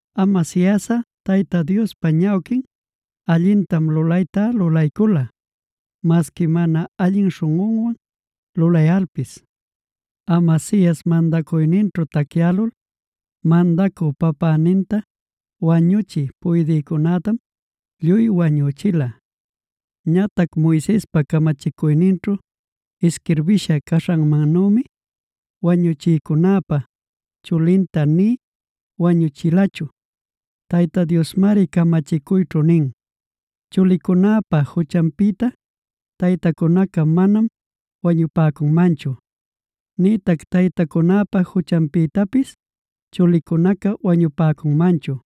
Amasiasꞌa Tayta Diospa ñawquin allintam lulaytá lulaycula, masqui mana allin śhunꞌunwan lulayalpis. Amasias mandacuyninćhu tacyälul, mandacü papäninta wañuchï puydïcunätam lluy wañüchila. Ñatac Moisespa camachicuyninćhu isquirbïsha caśhanmannümi, wañuchïcunäpa chulintá nï wañuchilachu. Tayta Diosmari camachicuyćhu nin: “Chulicunäpa juchanpïta taytacunaca manam wañupäcunmanchu, nïtac taytacunäpa juchanpïtapis chulicunaca wañupäcunmanchu.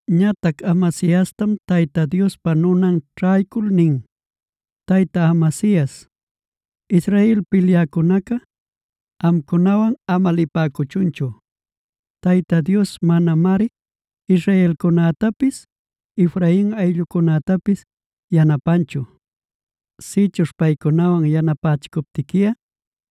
Ñatac Amasiastam Tayta Diospa nunan ćhaycul nin: “Tayta Amasias, Israel pilyäcunaca amcunawan ama lipäcuchunchu. Tayta Dios manamari israelcunätapis, Efrain ayllucunätapis yanapanchu. Sïchuśh paycunawan yanapächicuptiquiꞌa,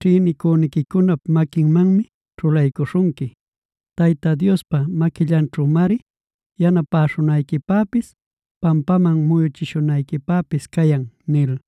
ćhïnicüniquicunap maquinmanmi ćhulaycüśhunqui. Tayta Diospa maquillanćhümari yanapäśhunayquipäpis, pampaman muyuchishunayquipäpis cayan” nil.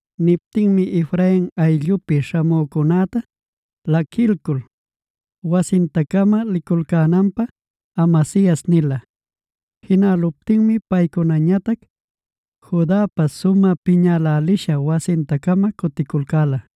Niptinmi Efrain ayllupi śhamücunäta laquilcul, wasinta-cama liculcänanpä Amasias nila. Jinäluptinmi paycunañatac Judapa sumä piñälälisha wasinta-cama cuticulcäla.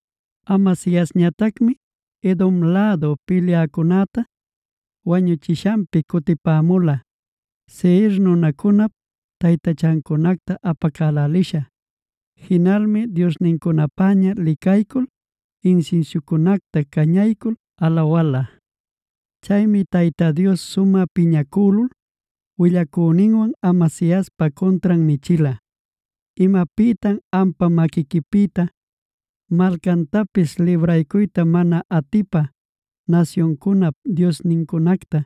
Amasiasñatacmi Edom lädu pilyäcunäta wañuchimuśhanpi cutipämula Seir nunacunap taytachancunacta apacälälisha. Jinalmi diosnincunapäña licaycul insinsiucunacta cañaycul alawala. Chaymi Tayta Dios sumä piñacülul willacüninwan Amasiaspa cuntran nichila: “¿Imapïtam ampa maquiquipïta malcantapis libraycuyta mana atipä nasyuncunap diosnincunacta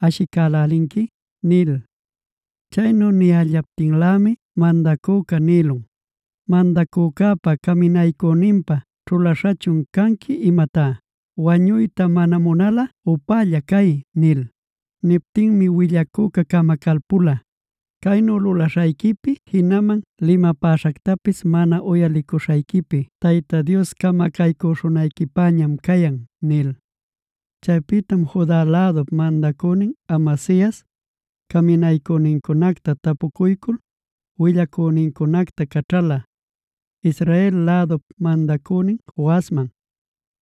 ashicälälinqui?” nil. Chaynu niyällaptinlämi mandacüca nïlun: “¿Mandacücäpa caminaycüninpä ćhulaśhachun canqui imatá? Wañuyta mana munalꞌa upälla cay” nil. Niptinmi willacüca camacalpula: “Caynu lulaśhayquipi jinaman limapäśhactapis mana uyalicuśhayquipi Tayta Dios camacaycüśhunayquipäñam cayan” nil. Chaypïtam Juda lädup mandacünin Amasias caminaycünincunacta tapucuycul, willacünincunacta caćhäla, Israel lädup mandacünin Joasman: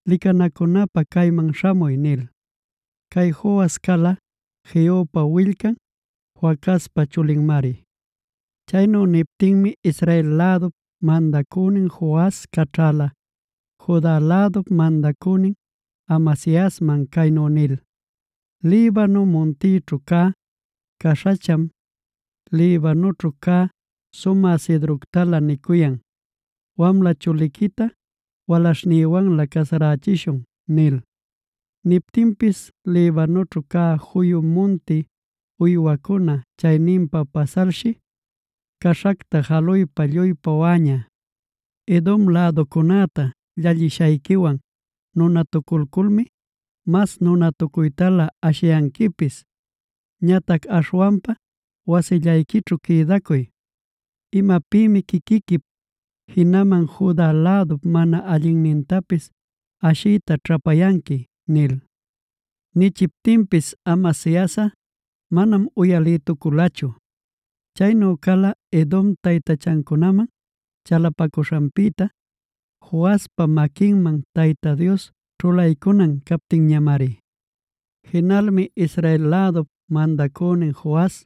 “Licanacunapä cayman śhamuy” nil. Cay Joas cala Jehupa willcan, Joacazpa chulinmari. Chaynu nichiptinmi Israel lädup mandacünin Joas caćhala Juda lädup mandacünin Amasiasman caynu nil: “Libano muntićhu cä caśhacham, Libanućhu cä sumä cedroctalä nicuyan: ‘Wamla chuliquita walaśhnïwanlä casarachishun’ nil. Niyaptinpis Libanućhu cä juyu munti uywacuna chayninpa pasalshi caśhacta jaluypa lluy pawäña. Edom läducunäta llallishayquiwan nunatuculculmi, mas nunatucuytalä ashiyanquipis. Ñatac aśhwanpa wasillayquićhu quïdacuy. ¿Imapïmi quiquiquip jinaman Juda lädup mana allinnintapis ashiyta ćhapayanqui?” nil. Nichiptinpis Amasiasꞌa manam uyalïtuculachu. Chaynu cala Edompa taytachancunaman chalapacuśhanpïta, Joaspa maquinman Tayta Dios ćhulaycunan captinñamari. Jinalmi Israel lädup mandacünin Joas,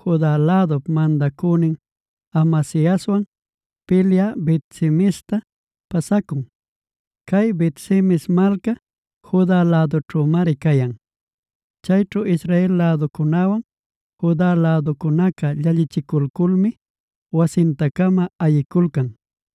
Juda lädup mandacünin Amasiaswan pilyä Bet-semesta pasacun. Cay Bet-semes malca Juda lädućhümari cayan. Chayćhu Israel läducunäwan Juda läducunaca llallichiculculmi wasinta-cama ayiculcan.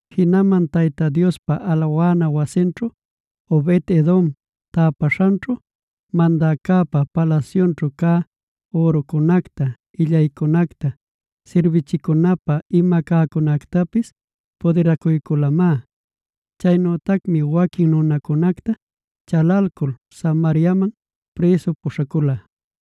Jinaman Tayta Diospa alawana wasinćhu Obed-edom täpaśhanćhu, mandäcäpa palasyućhu cä ürucunacta, illaycunacta, sirbichicunapä ima cäcunactapis pudiracuyculamá. Chaynütacmi waquin nunacunacta chalalcul Samariaman prïsu puśhacula.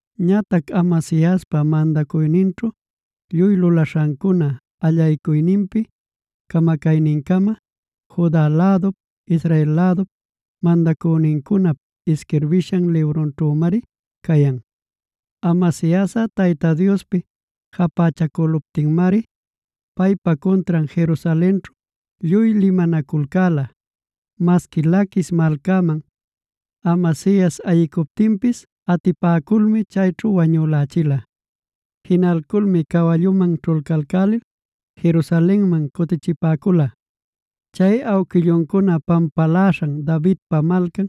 Ñatac Amasiaspa mandacuyninćhu lluy lulaśhancuna, allaycuyninpi camacaynincama Juda lädup, Israel lädup mandacünincunap isquirbishan librunćhümari cayan. Amasiasꞌa Tayta Diospi japächacüluptinmari paypa cuntran Jerusalenćhu lluy limanaculcäla. Masqui Laquis malcaman Amasias ayicuptinpis atipäculmi chayćhu wañülächila. Jinalculmi cawalluman ćhulcalcälil Jerusalenman cutichipäcula. Chay awquilluncuna pampaläśhan Davidpa Malcan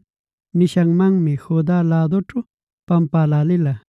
nishanmanmi Juda lädućhu pampälälila.